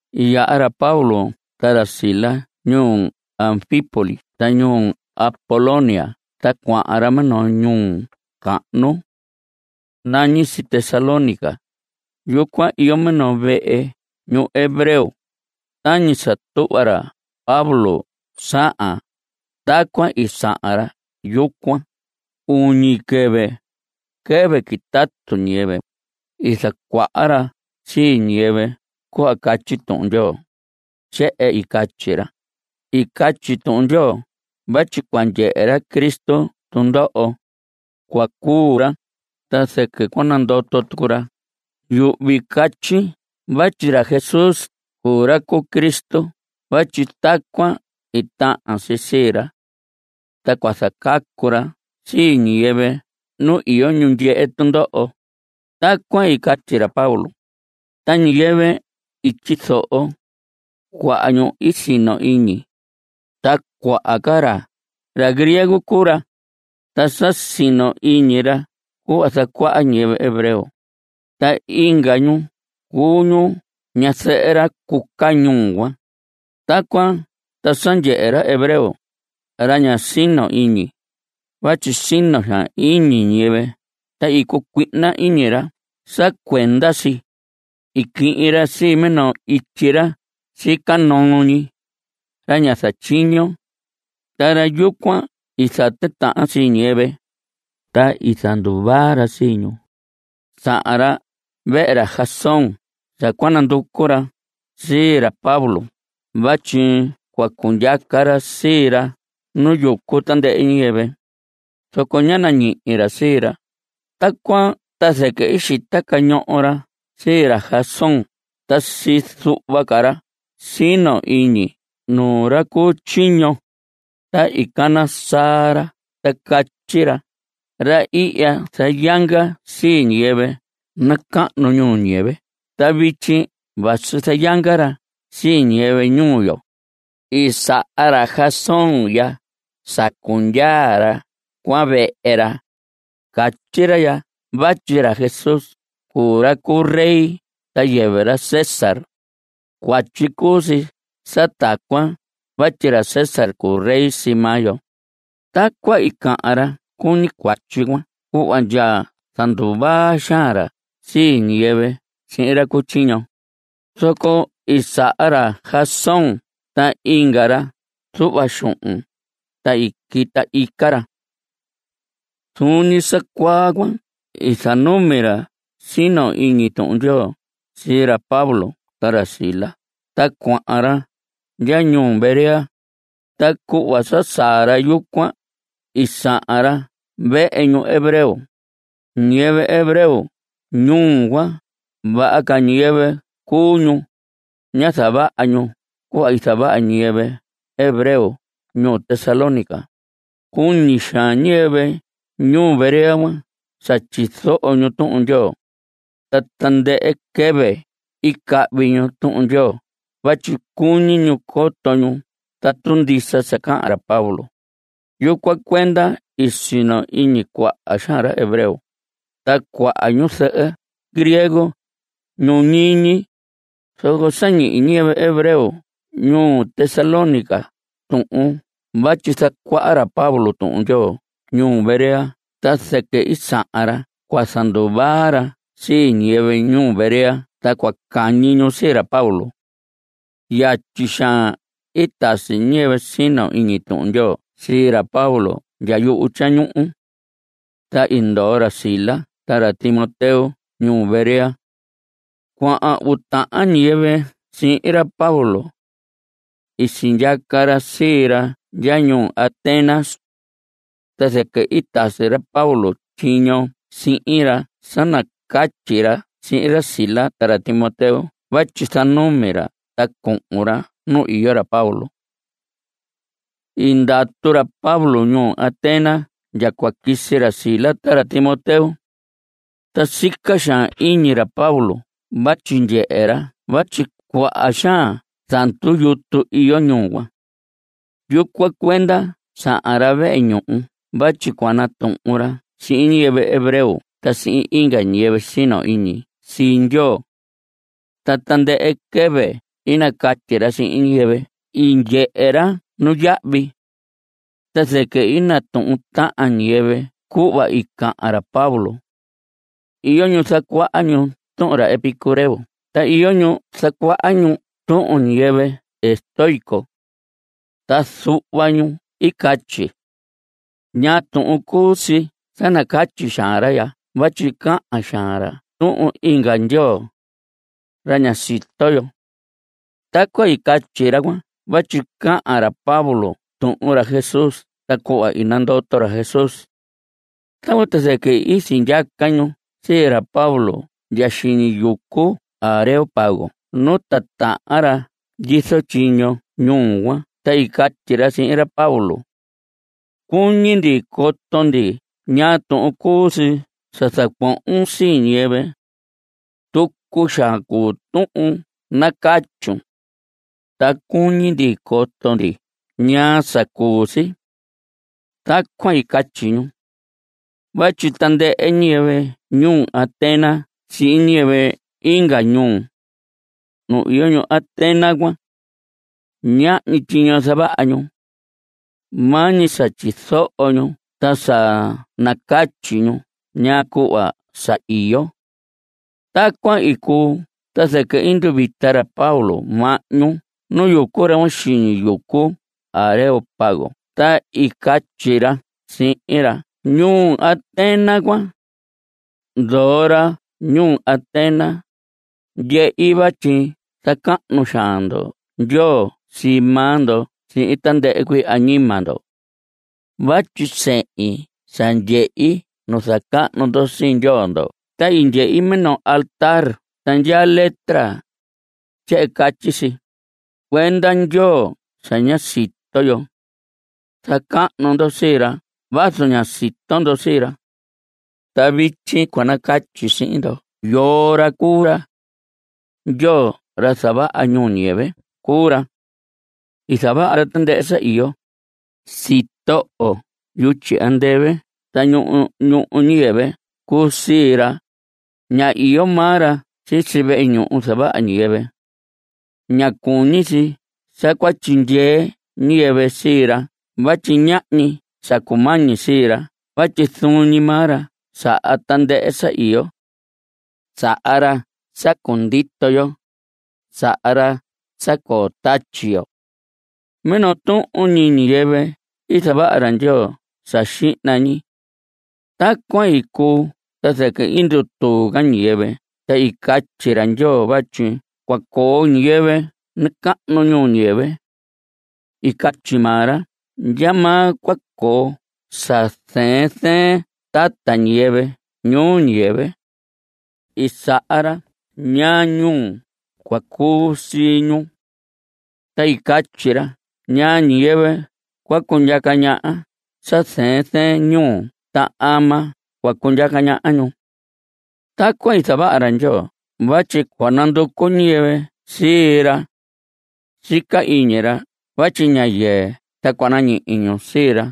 I yaha ra Pablo ta ra Silas ñuu Anfípolis ta ñuu Apolonia ta cuahan ra minoo ñuu cahnu. Nañi si Tesalónica. Yucuan iyo minoo vehe ñuhu hebreo. Ta tañi sa tuhva ra Pablo sahan, tacuan i sahan ra yucuan. Uñi quɨvɨ, quɨvɨ quitatu ñiyɨvɨ, i zacuaha ra sii ñiyɨvɨ cuhva catyi Tuhun Ndyoo. Tyehen i catyi ra: I catyi Tuhun Ndyoo vatyi cua ndyehe ra Cristo tundoho. Cua cuu ra, ta zɨquɨ cua nandoto tucu ra. Yuhvi catyi vatyi ra Jesús cuu ra cu Cristo vatyi tacuan i tahan si sii ra. Ta cua zacacu ra sii ñiyɨvɨ nu iyo ñu ndyehe tundoho. Tacuan i catyi ra Pablo. Ta ñiyɨvɨ i tyizoho, cuaha ñu i sino iñi. Ta cuaha ca ra, ra griego cuu ra. Ta sa sino iñi ra cuhva zacuaha ñiyɨvɨ hebreo. Ta inga ñu cuu ñu ñazɨhɨ ra cuca ñuu cuan. Tacuan ta sa ndyehe ra hebreo, ra ña sino iñi, vatyi sino xaan iñi ñiyɨvɨ ta i cucuihna iñi ra sa cuenda si. I quihin ra sii minoo ityi ra sica noo ñi, ra ña zatyiño, ta ra yucuan i zatitahan sii ñiyɨvɨ, ta i zanduvaa ra sii ñu. Sahan ra vehe ra Jasón sa nanducu ra sii ra Pablo vatyi cua cundyaca ra sii ra nu yucu tandɨhɨ ñiyɨvɨ. Zoco ñá nañihi ra sii ra. Tacuan ta zɨquɨ i xita cañoho ra sii ra Jasón ta sii zuhva ca ra sino iñi nuu ra cu tyiño. Ta i cana saa ra ta catyi ra: Ra ihya zayanga sii ñiyɨvɨ nacahnu ñuu ñiyɨvɨ ta vityi vasi zayanga ra sii ñiyɨvɨ ñuu yo. I saha ra Jasón ya sa cundyaa ra cuan vehe ra. Catyi ra ya vatyi ra Jesús cuu ra cu rey ta yɨvɨ ra César. Cuatyi cuu si sa tacuan vatyi ra César cuu rey sii maa yo. Tacuan i cahan ra cuñi cuatyi cuan cuhva ndya zanduvaa xaan ra sii ñiyɨvɨ sihin ra cu tyiño. Zoco i saha ra Jasón ta inga ra zuhva xuhun, ta i quita ica ra. Zuun ñi sa cuaa cuan i zanumi ra sino iñi Tuhun Ndyoo sii ra Pablo ta ra Silas ta cuahan ra ndya ñuu Berea. Ta cuhva sa saa ra yucuan, i sahan ra vehe ñuhu hebreo. Ñiyɨvɨ hebreo ñuu cuan vaha ca ñiyɨvɨ cuu ñu. Ñá zavaha ñu cuhva i zavaha ñiyɨvɨ hebreo ñuu Tesalónica. Cuñi xaan ñiyɨvɨ ñuu Berea sa tyizoho ñu Tuhun Ndyoo. Ta tandɨhɨ quɨvɨ i cahvi ñu Tuhun Ndyoo vatyi cuñi ñu coto ñu tatu ndisa sa cahan ra Pablo. Yucuan cuenda i sino iñi cuaha xaan ra hebreo, ta cuaha ñuzɨhɨ griego, ñu ñiñi. Zoco sa ñihi ñiyɨvɨ hebreo ñuu Tesalónica tuhun vatyi zacuaha ra Pablo Tuhun Ndyoo ñuu Berea ta zɨquɨ sahan ra cua zanduvaa ra sii ñiyɨvɨ ñuu Berea ta cua cahñi ñu sii ra Pablo. Yatyi xaan i tasi ñiyɨvɨ sino iñi Tuhun Ndyoo sii ra Pablo ndya yuhu tyañuhu. Ta i ndoo ra Silas ta ra Timoteo ñuu Berea. Cuahan uu tahan ñiyɨvɨ sihin ra Pablo. Sindyaca ra sii ra ndya ñuu Atenas. Ta zɨquɨ i tasi ra Pablo tyiño sihin ra sa nacatyi ra sihin ra Silas ta ra Timoteo vatyi zanumi ra ta cuhun ra nu iyo ra Pablo. I ndatu ra Pablo ñuu Atenas ndya cua quisi ra Silas ta ra Timoteo. Ta sica xaan iñi ra Pablo vatyi ndyehe ra vatyi cuaha xaan zandu yutu iyo ñuu cuan. Yucuan cuenda sahan ra vehe ñuhu vatyi cua natuhun ra sihin ñiyɨvɨ hebreo ta sihin inga ñiyɨvɨ sino iñi sii Ndyoo. Ta tandɨhɨ quɨvɨ i nacatyi ra sihin ñiyɨvɨ i ndyehe ra nuyahvi. Ta zɨquɨ i natuhun tahan ñiyɨvɨ cuhva i cahan ra Pablo. Iyo ñu zacuaha ñu tuhun ra Epicúreo ta iyo ñu zacuaha ñu tuhun ñiyɨvɨ estoico. Ta zuhva ñu i catyi: ¿Ñaa tuhun cuu si sa nacatyi xaan ra ya vatyi cahan xaan ra tuhun inga ndyoo, ra ña sito yo? Tacuan i catyi ra cuan vatyi cahan ra Pablo tuhun ra Jesús ta cuhva i nandoto ra Jesús. Tacuan ta zɨquɨ i sindyaca ñu sii ra Pablo ndya xiñi yucu Areópago nu titahan ra ndyizo tyiño ñuu cuan ta i catyi ra sihin ra Pablo: Cuñi ndi coto ndi ñaa tuhun cuu si sa zacuohon sii ñiyɨvɨ. Tucu xaan cuu tuhun nacatyun, ta cuñi ndi coto ndi ñaa sa cuu si. Tacuan i catyi ñu. Vatyi tandɨhɨ ñiyɨvɨ ñuu Atenas sihin ñiyɨvɨ inga ñuu, ñu iyo ñuu Atenas cuan, ñahñi tyiño zavaha ñu. Maa ñi sa tyizoho ñu ta sa nacatyi ñu ñaa cuhva saa iyo. Tacuan i cuu ta zɨquɨ i nduvita ra Pablo mahñu nu yucu ra cuan xiñi yucu Areópago ta i catyi ra sihin ra ñuu Atenas cuan: Ndoho ra ñuu Atenas, ndyehi vatyi zacahnu xaan ndo ndyoo sii maa ndo sihin tandɨhɨ cuii añima ndo. Vatyi sehin sa ndyehi nu zacahnu ndo sii ndyoo ndo ta i ndyehi minoo altar ta ndyaa letra. Tyehen catyi si: “Cuenda ndyoo sa ña sito yo.” Zacahnu ndo sii ra vazu ña sito ndo sii ra. Ta vityi cua nacatyi sihin ndo yoo ra cuu ra. Ndyoo, ra zavaha ñuu ñiyɨvɨ cuu ra. I zavaha ra tandɨhɨ sa iyo. Sitoho yutyi andɨvɨ ta ñuhu ñuu ñiyɨvɨ cuu sii ra. Ña iyo maa ra sisi vehe ñuhu zavaha ñiyɨvɨ. Ña cuñi si sa cua tyindyee ñiyɨvɨ sii ra vatyi ñahñi sa cumañi sii ra vatyi zuun ñi maa ra saha tandɨhɨ sa iyo. Saha ra sa cundito yo. Saha ra sa coo tatyi yo. Minoo tuhun ñi ñiyɨvɨ i zavaha ra Ndyoo sa xihna ñi. Tacuan i cuu ta zɨquɨ i ndutuu ca ñiyɨvɨ ta i catyi ra Ndyoo vatyi cua coo ñiyɨvɨ nacahnu ñuu ñiyɨvɨ. I catyi maa ra ndyamaa cua coo sa zɨɨn zɨɨn tata ñiyɨvɨ ñuu ñiyɨvɨ, ta i saha ra ñaa ñuhu cua cuu sii ñu. Ta i catyi ra ñaa ñiyɨvɨ cua cundyaca ñaha sa zɨɨn zɨɨn ñuhu ta ama cua cundyaca ñaha ñu. Tacuan i zavaha ra Ndyoo vatyi cua nanducu ñiyɨvɨ sii ra. Sica iñi ra vatyi ña yɨɨ ta cua nañihi ñu sii ra.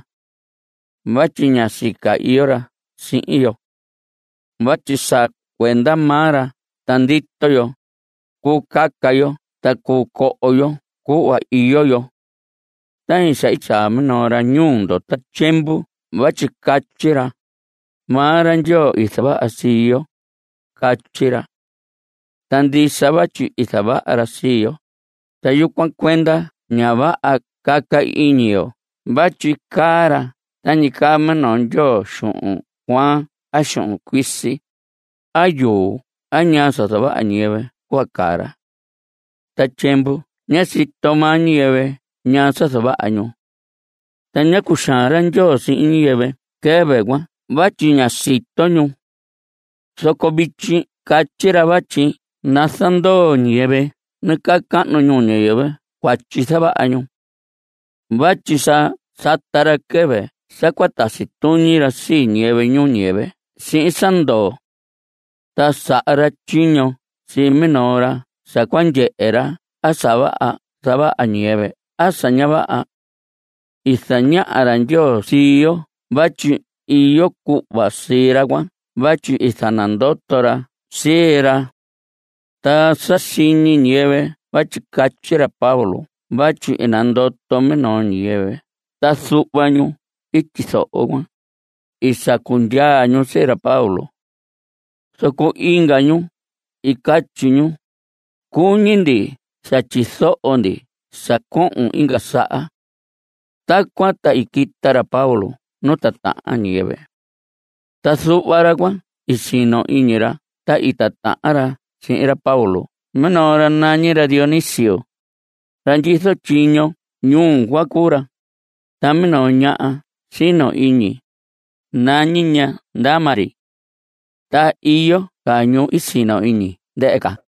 Vatyi ña sica iyo ra sihin yo. Vatyi sa cuenda maa ra ta ndito yo, cuu caca yo ta cuu coo yo cuhva iyo yo. Tañi sa i tyaa minoo ra ñuu ndo ta tyiemvu vatyi catyi ra: “Maa ra Ndyoo i zavaha sii yo.” Catyi ra. Ta ndisa vatyi i zavaha ra sii yo, ta yucuan cuenda ña vaha caca iñi yo vatyi caa ra tañi caa minoo ndyoo xuhun cuaan a xuhun cuisi, a yuu a ñaa sa zavaha ñiyɨvɨ cuhva caa ra. Ta tyiemvu ñá sito maa ñiyɨvɨ ñaa sa zavaha ñu. Ta ñá cuxaan ra Ndyoo sihin ñiyɨvɨ quɨvɨ cuan vatyi ñá sito ñu. Zoco vityi catyi ra vatyi nazandoo ñiyɨvɨ nacahnu ñuu ñiyɨvɨ cuatyi zavaha ñu. Vatyi sa sata ra quɨvɨ sa cua tasi tuñi ra sii ñiyɨvɨ ñuu ñiyɨvɨ sihin sa ndoo. Ta saha ra tyiño sii minoo ra sa cua ndyehe ra a sa vaha zavaha ñiyɨvɨ a sa ña vaha. I zañaha ra Ndyoo sii yo vatyi iyo cuhva sii ra cuan vatyi i zanandoto ra sii ra. Ta sa siñi ñiyɨvɨ vatyi catyi ra Pablo vatyi i nandoto minoo ñiyɨvɨ ta zuhva ñu tyizoho cuan, i sacu ndyaa ñu sii ra Pablo. Zoco inga ñu i catyi ñu: Cuñi ndi sa tyizoho ndi sa cohon inga saha. Tacuan ta i quita ra Pablo nu titahan ñiyɨvɨ. Ta zuhva ra cuan i sino iñi ra ta i titahan ra sihin ra Pablo. Minoo ra nañi ra Dionisio. Ra ndyizo tyiño ñuu cuan cuu ra. Ta minoo ñaha sino iñi, nañi ña Dámaris. Ta iyo ca ñu sino iñi ndɨhɨ ca.